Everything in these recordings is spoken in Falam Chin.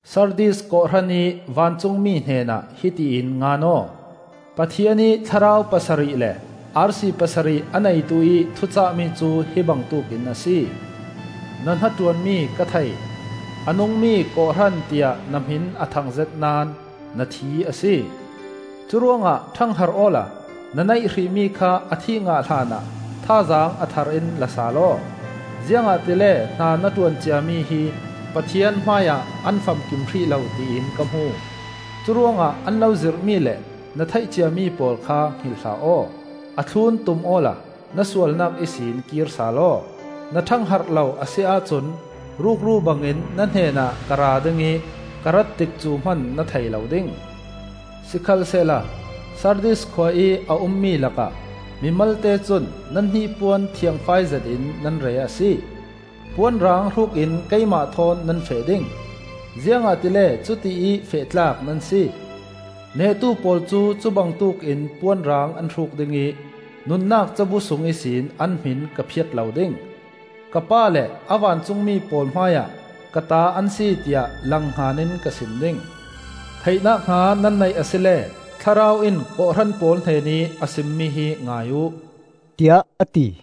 “Sardis kawhhran ih vancungmi hnenah hiti in ngan aw: “Pathian ih thlarau pasarih le arsi pasarih a neituih thucahmi cu hi bangtuk in a si. Na hnaṭuanmi ka thei; a nungmi kawhhran tiah na hmin a thangzet naón na thi a si. Curuangah ṭhangharh awla na neih hrihmi kha a thih ngah hlanah thazaang a thar in la sal aw. Ziangahtile hna na ṭuan ciami hi Pathian hmaiah an famkim hrih lo tiin ka hmu. Curuangah an lo zirhmi le na theih ciami pawl kha hngilh hlah aw; a thlun tum awla na sualnak ihsin kir sal aw. Na ṭhangharh lo a si ahcun rukru bangin na hnenah ka ra ding ih ka rat tikcu hman na thei lo ding. Sikhalsehla Sardis khua ih a ummi lakah mi malte cun nan hnipuan thiangfai zetin nan re a si. Puan rang hrukin keimah thawn nan feh ding, ziangahtile cutiih feh tlak nan si. Nehtu pawl cu cubangtuk in puan rang an hruk ding ih nunnak cabu sung ihsin an hmin ka phiat lo ding. Ka Pa le a vancungmi pawl hmaiah ‘Ka ta an si,’ tiah langhngan in ka sim ding. “Theihnak hna nan neih asile Thlarau in kawhhran pawl hnenih a simmi hi ngai uh,” tiah a ti.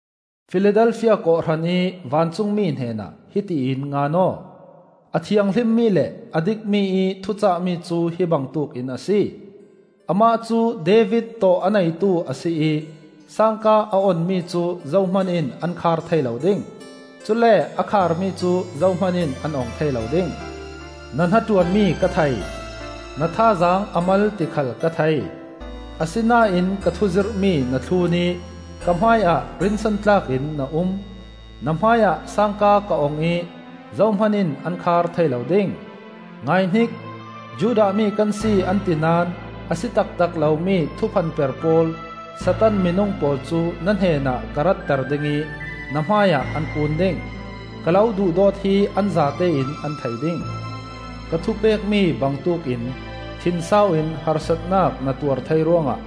“Filadelfia kawhhran ih vancungmi hnenah hiti in ngan aw: “A thianghlimmi le a dikmi-ih thucahmi cu hi bangtuk in a si. Amah cu David tawh a neitu a si ih sangka a onmi cu zohman in an khar thei lo ding; cule a kharmi cu zohman in an ong thei lo ding. Na hnaṭuanmi ka thei; na thazaang a mal ti khal ka thei. Asinain ka thuzirhmi na thlun ih ka hmaiah rinsan tlak in na um. Na hmaiah sangka ka ong ih zohman in an khar thei lo ding. Ngaihnik! Judah mi kan si, an ti naón a si taktak lomi thuphanper pawl, Satan minung pawl cu na hnenah ka ratter dingih na hmaiah an kun ding. Ka lo duhdawt hi an zatein an thei ding. Ka thupekmi bangtuk in thinsau in harsatnak na tuar thei ruangah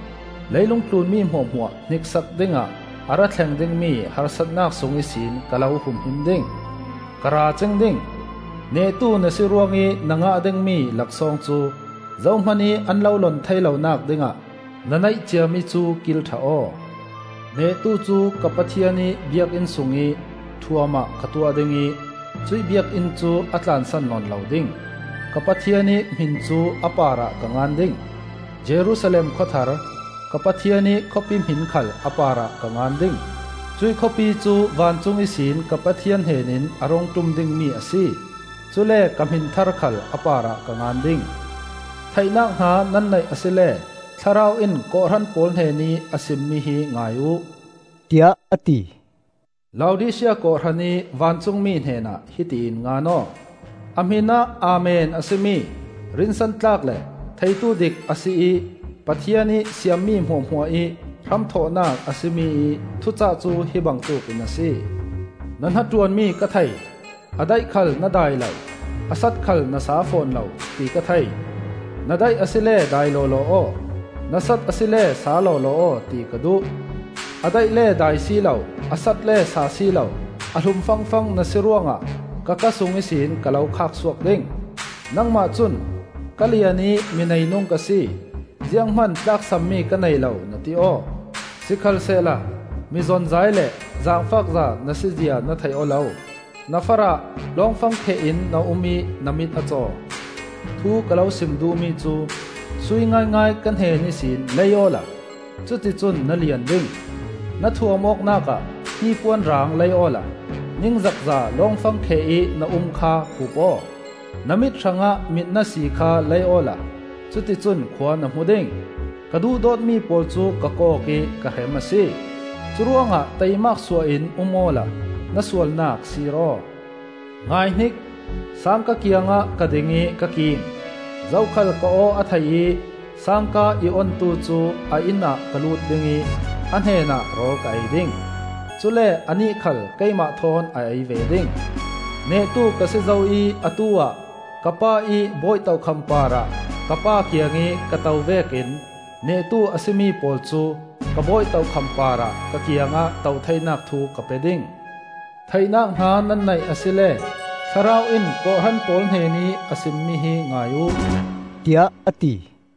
leilungtlun mi hmuahhmuah hniksak dingah a ra thleng dingmi harsatnak sung ihsin ka lo humhim ding. Ka ra cing ding. Nehtu na si ruangih na ngah dingmi laksawng cu zohmanih an lo lon theilonak dingah na neih ciami cu kil ṭha aw. Nehtu cu ka Pathian ih biakinn sungih ṭhuam ah ka tuah ding ih cuih biakinn cu a tlansan nawn lo ding. Ka Pathian ih hmin cu a parah ka ngan ding; Jerusalem khua thar, ka Pathian ih khawpi hmin khal a parah ka ngan ding. Cuih khawpi cu vancung ihsin ka Pathian hnenin a rung ṭum dingmi a si. Cule ka hmin thar khal a parah ka ngan ding. “Theihnak hna nan neih asile Thlarau in kawhhran pawl hnenih a simmi hi ngai uh,” tiah a ti. “Laodisia kawhhran ih vancungmi hnenah hiti in ngan aw: A hminah Amen a si mi, rinsantlak le theitudik a si ih Pathian ih siammi hmuahhmuah ih hramthawhnak a si mi-ih thucah cu hi bangtuk in a si. Na hnaṭuanmi ka thei. A daih khal na dai lo, a sat khal na sa fawn lo, ti ka thei. Na daih asile dai lawlaw aw, na sat asile sa lawlaw aw, ti ka duh. A daih le dai si lo, a sat le sa si lo; a hlum fangfang na si ruangah ka ka sung ihsin ka lo khak suak ding. Nangmah cun, ‘Ka lian ih mi neinung ka si; zianghman tlaksammi ka nei lo,’ na ti aw. Sikhalsehla mizonzai le zangfakza na si zia na thei aw lo. Na farah, lawngfangkheh in na um ih na mit a caw. Thu ka lo sim duhmi cu, sui ngaingai ka hnen ihsin lei awla cuticun na lian ding. Na thuam awknak ah hnipuan rang lei awla, ningzakza lawngfangkheh ih na um kha hup aw. Na mit hrangah mitna sii khal lei awla cuticun khua na hmu ding. Ka duhdawtmi pawl cu ka kawk ih ka hrem a si. Curuangah taimak suah in um awla na sualnak sir aw. Ngaihnik! sangka kiangah ka ding ih ka king. Zokhal ka aw a thei ih sangka i ontu cu a innah ka lut dingih a hnenah rawl ka ei ding; cule anih khal keimah thawn a ei ve ding. Nehtu ka si zo ih atu-ah ka Pa ih bawi tokham parah ka Pa kiangih ka to vekin nehtu a si mi pawl cu ka bawi tokham parah ka kiangah to theinak thu ka pe ding. “Theihnak hna nan neih asile Thlarau in kawhhran pawl hnenih a simmi hi ngai uh,” tiah a ti.